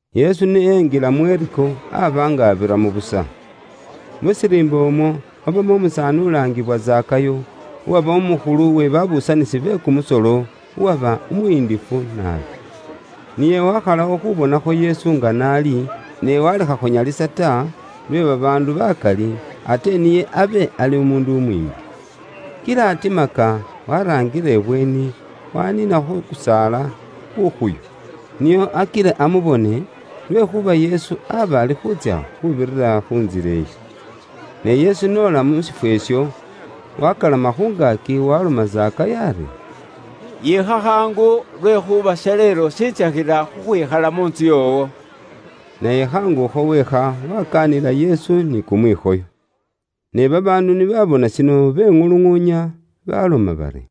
Yesu ni enjila mu Yeriko, aba nga abiramo busa. Mu shiriimba umwo, mwabamo umusaani ulaangiwa Zakayo, uwaba umukhulu we babuusanisi be kumusolo, uwaba umuyindifu naabi. Niye wakhalawo khubonakho Yesu nga n'ali, ne walekha khunyalisa ta, lwe babaandu bakali, ate niye abe ali umuundu umwiimbi. Kila atimaka, waraangila ibweeni, waniina khu kusaala kukhuyu, nio akile amubone, lwekhuuba Yesu aba alikhuutsya khuubirira khu ntsila iyo. Ne Yesu n'ola mu shifwo isho, wakalama khu ngaaki waloma Zakayo ari, “Yiikha khaangu, lwekhuuba shaleelo, shintsakhila khukhwikhala mu ntsu yoowo.” Naye khaangu akho wiikha, wakaanila Yesu ni kumwikhoyo. Ne babaandu ni baabona shino beŋuluŋuunya, baloma bari,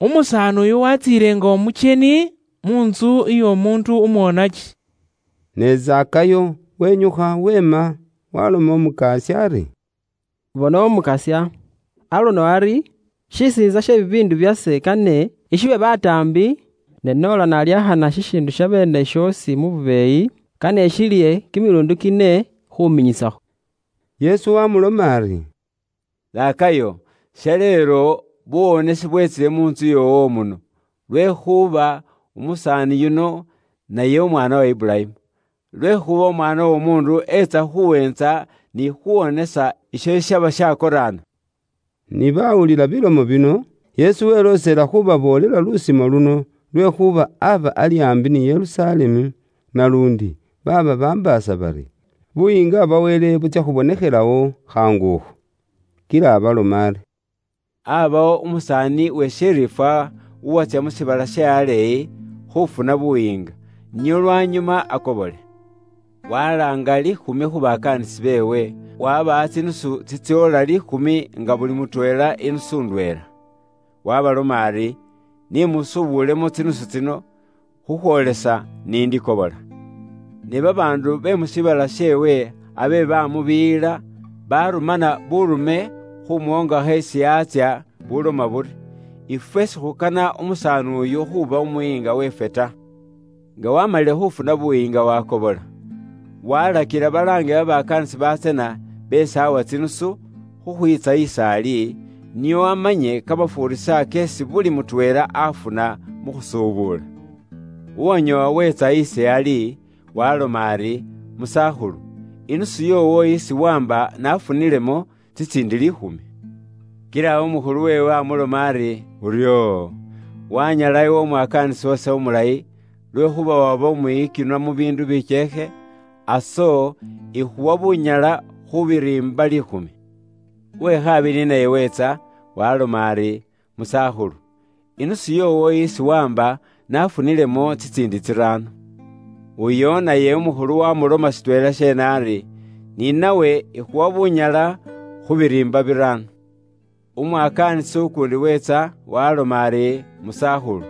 “Umusaani uyu watsiile nga umukyeni mu ntsu y'omuundu umwonaki.” Ne Zakayo wenyukha weema, waalomela Umukasya ari, “Bona Umukasya, aluno ari, shisiintsa she bibiindu byase kane ishiwe bataambi, ne noola nalyakhana shishiindu shabeene shoosi mu bubeeyi, kane ishilihe kimiluundi kine khuminyisakho.” Yesu wamuloma ari, “Zakayo, shaleelo, buwonesi bwetsile mu ntsu yoowo muno, lwekhuuba, umusaani yuno, naye umwaana wa Iburayimu. Lwekhuuba Umwaana w'Omuundu, etsa khuweentsa, ni khuwonesa, isho shishaba shakoraana.” Ni bawulila bilomo bino, Yesu weloosela khubaboolela lusimo luno lwekhuuba aba ali aambi ni Yerusalemu, naluundi baaba bambaasa bari Buyiinga bwa Wele butsya khubonekhelawo khaangu akho. Kila abaloma ari: “Aabawo umusaani we shiriifwa uwatsya mu shiibala she aleeyi, khuufuna buyiinga, nio lwanyuma akobole. Walaanga liikhumi khu bakaanisi beewe, waabawa tsinusu tsitsoola liikhumi nga buli mutweela inusu ndweela. Waabaloma ari, ‘Ni musubulemo tsinusu tsino, khukhwoolesa ni ndikobola.’ “Ne babaandu be mu shiibala sheewe abe baamubiiyila, baarumana buurume khuumwoongakho isi aatsya nga buloma buri, ‘Ifwe sikhukana umusaani uyu khuuba umuyiinga weefwe ta.’ “Nga waamalile khuufuna buyiinga waakobola. Waalakila balaange babakaanisi batsana, beesi aawa tsinusu, khukhwiitsa is'ali, nio amanye kamafuurisa keesi buli mutweela aafuna mu khusubula. “Uwanyoowa weetsa ali, waaloma ari, ‘Musakhulu, inusu yoowo isi waamba naafunilemo tsitsiindi liikhumi.’ Kila umukhulu weewe amuloma ari, ‘Uryoo! Waanyala iwe umwakaanisi wase umulayi, lwekhuuba waba umwiyikinwa mu biindu bikyeekhe, aso ikhuwa bunyala khu biriimba liikhumi.’ “Uwe khabili naye weetsa, waaloma ari, ‘Musakhulu, inusu yoowo isi waamba naafunilemo tsitsiindi tsiraano.’ Uyo naye umukhulu waamuloma shitweela sheene ari, ‘Ni nawe ikhuwa bunyala khu biriimba biraano.’ “Umwakaanisi ukuundi weetsa, waaloma ari, ‘Musakhulu,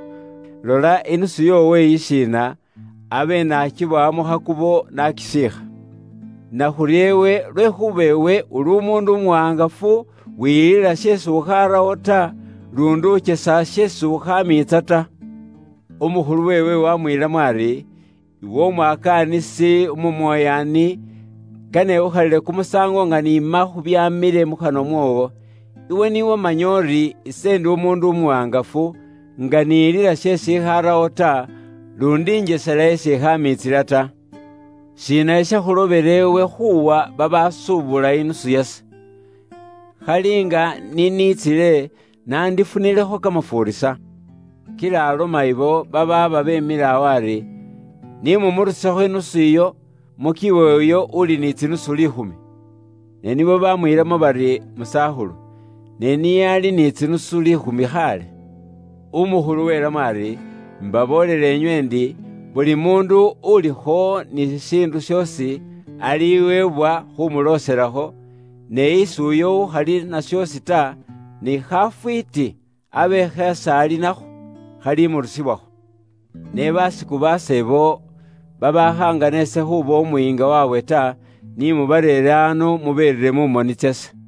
lola, inusu yoowo iyishiina, abe naakibowa mu khakubo, naakisiikha. Nakhurya iwe, lwekhuuba iwe, uli umuundu umuwaangafu, wiyilila sheesi ukhaarawo ta, luundi ukyesa sheesi ukhaamiitsa ta.’ “Umukhulu weewe waamwiilamo ari, ‘Iwe umwakaanisi umumoyaani, kane ikhukhalile kumusaango nga niima khu byaamile mukhanwa mwoowo. Iwe ni wamanya uri ise ndi umuundu umuwaangafu, nga niyilila sheesi ikhaarawo ta, luundi injesela isi ikhaamiitsila ta. Shiina shishakhulobela iwe khuuwa babaasuubula inusu yase? Khali nga ni niitsile, nandifunilekho kamafuurisa.’ “Kila aloma abo babaaba beemile awo ari, ‘Ni mumurusekho inusu iyo, mukiwe uyo uuli ni tsinusu liikhumi.’ “Ne nibo baamwiilamo bari, ‘Musakhulu, ne niye ali ni tsinusu liikhumi khaale.’ “Umukhulu welamo ari, imbaboolela inywe ndi, buli muundu ulikho ni shishiindu shoosi, aliweebwa khuumulooselakho, ne isi uyo ukhali na shoosi ta, ni khafwiiti abe kheesi ali nakho khalimurusibwakho. Ne baasiku baase abo, babaakhaangana ise khuuba umuyiinga waabwe ta, ni mubareere ano, muberire mu moni tsase.”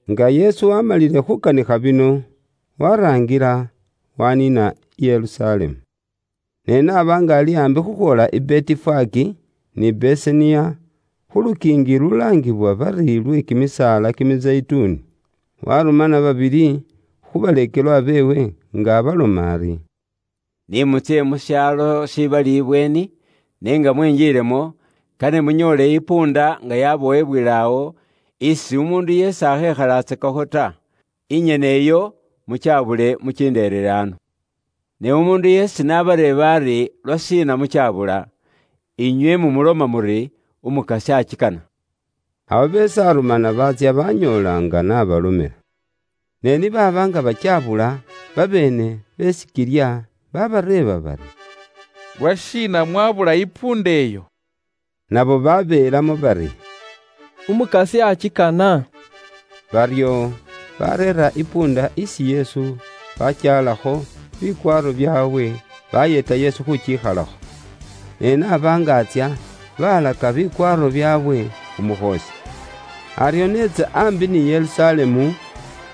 Nga Yesu waamalile khuukanikha bino, waaraangila, waaniina i Yerusalemu. Ne n'aba nga ali aambi khukhwoola i Betifage, ni Besaniya, khu lukiingi lulaangiwa bari lwe Kimisaala kimizeyituni, warumana babili khu baleekelwa beewe, nga abaloma ari: “Ni mutsye mu shaalo shibali ibweeni, ne nga mwinjilamo, kane munyoole isikilya nga yabowebwele awo, isi umuundu yeesi akhekhalatsakakho ta. Inyene iyo, mukyabule, mukinderere ano. Ne umuundu yeesi n'abareeba ari, ‘Lwashiina mukyabula?’ Inywe mumuloma muri, Umukasya akikana.” Abo beesi arumana baatsya banyoola nga n'abalomela. Ne ni baaba nga bakyabula, babeene be sikilya, babareeba bari, “Lwashiina mwabula isikilya iyo?” Nabo babeelamo bari, “Umukasya akikana.” Baryo, bareera isikilya isi Yesu, baakyalakho bikwaaro byaabwe, bayeeta Yesu khuukikhalakho. Ne n'aba nga atsya, baalaka bikwaaro byaabwe khu mukhoosi. Aryo n'etsa aambi ni Yerusalemu,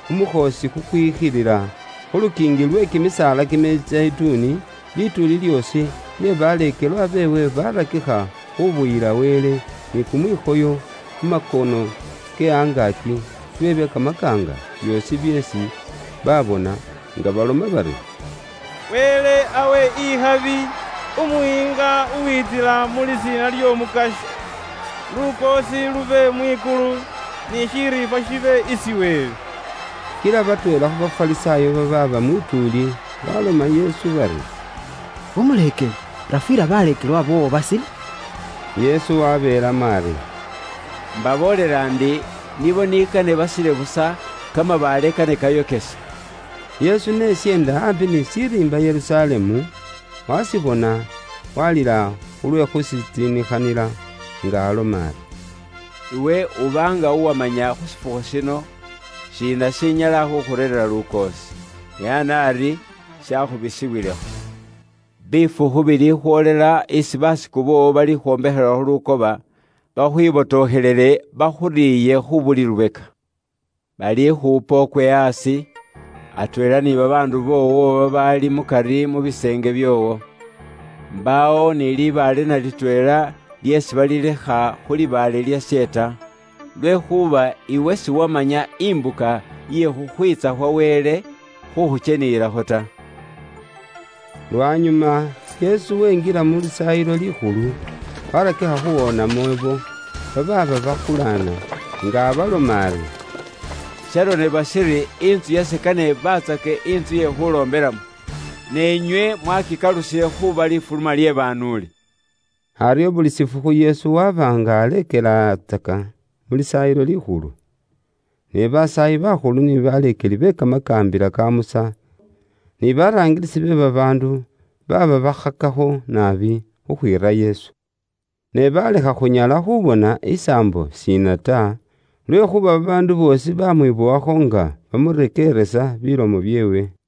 khu mukhoosi kukwikhilila khu lukiingi lwe kimisaala Kimizeyituni, lituuli lyoosi lye baleekelwa beewe barakikha khubuyila Wele ni kumwikhoyo, mu makono ke angaaki, lwe bye kamakaanga byoosi byeesi baabona, nga baloma bari: “Wele awe ikhabi Umuyiinga uwitsila mu lisiina ly'Omukasya. Lukoosi lube mwikulu ni shiriifwa shibe isi Wele.” Kila batweela khu Bafarisaayo babaaba mwituuli, baloma Yesu bari, “Umuleekeli, rafuyila baleekelwa boowo basile.” Yesu wabeelamo ari: “Mbaboolela ndi, nibo ni kane basile busa, kamabaale kane kayokese.” Yesu ni esyeenda aambi ni shiriimba Yerusalemu, washibona, walila khulwe khushitsiinikhanila, nga aloma ari, “Iwe uba nga uwamanya khu shifukhu shino, shiina shinyala khukhureerera lukoosi! Ne ana ari shakhubisiwilekho. Bifukhu bilikhwoolela isi basiku boowo balikhwombekhelakho lumako, bakhwibotokhelele, bakhuriiye khu buli lubeka. Balikhuupa ukwe aasi, atweela ni babaandu boowo babaali mukari mu biseenge byoowo. Mbaawo ni libaale na litweela lyeesi balilekha khu libaale lyashe ta. Lwekhuuba iwe siwamanya imbuka iye khukhwiitsa khwa Wele khukhukyeniyilakho ta.” Lwanyuma, Yesu wenjila mu Lisaayilo Likhulu, warakikha khuwoonamo ibo, babaaba bakulaana, nga abaloma ari: “Sharonebwa shiri, ‘Intsu yase kane ibaatsake intsu ye khuuloombelamo, ne inywe mwaakikalusile khuuba lifuluma lye banuuli.’” Aryo buli shifukhu Yesu waba nga aleekelatsaka mu Lisaayilo Likhulu. Ne basaayi bakhulu ni baleekeli be Kamakaambila ka Musa, ni baraangilisi be babaandu, baaba bakhakakho naabi khukhwiira Yesu. Ne baalekha khunyala khubona isaambo shiina ta, lwekhuuba babaandu boosi baamwibowakho nga bamurekeeresa bilomo byeewe.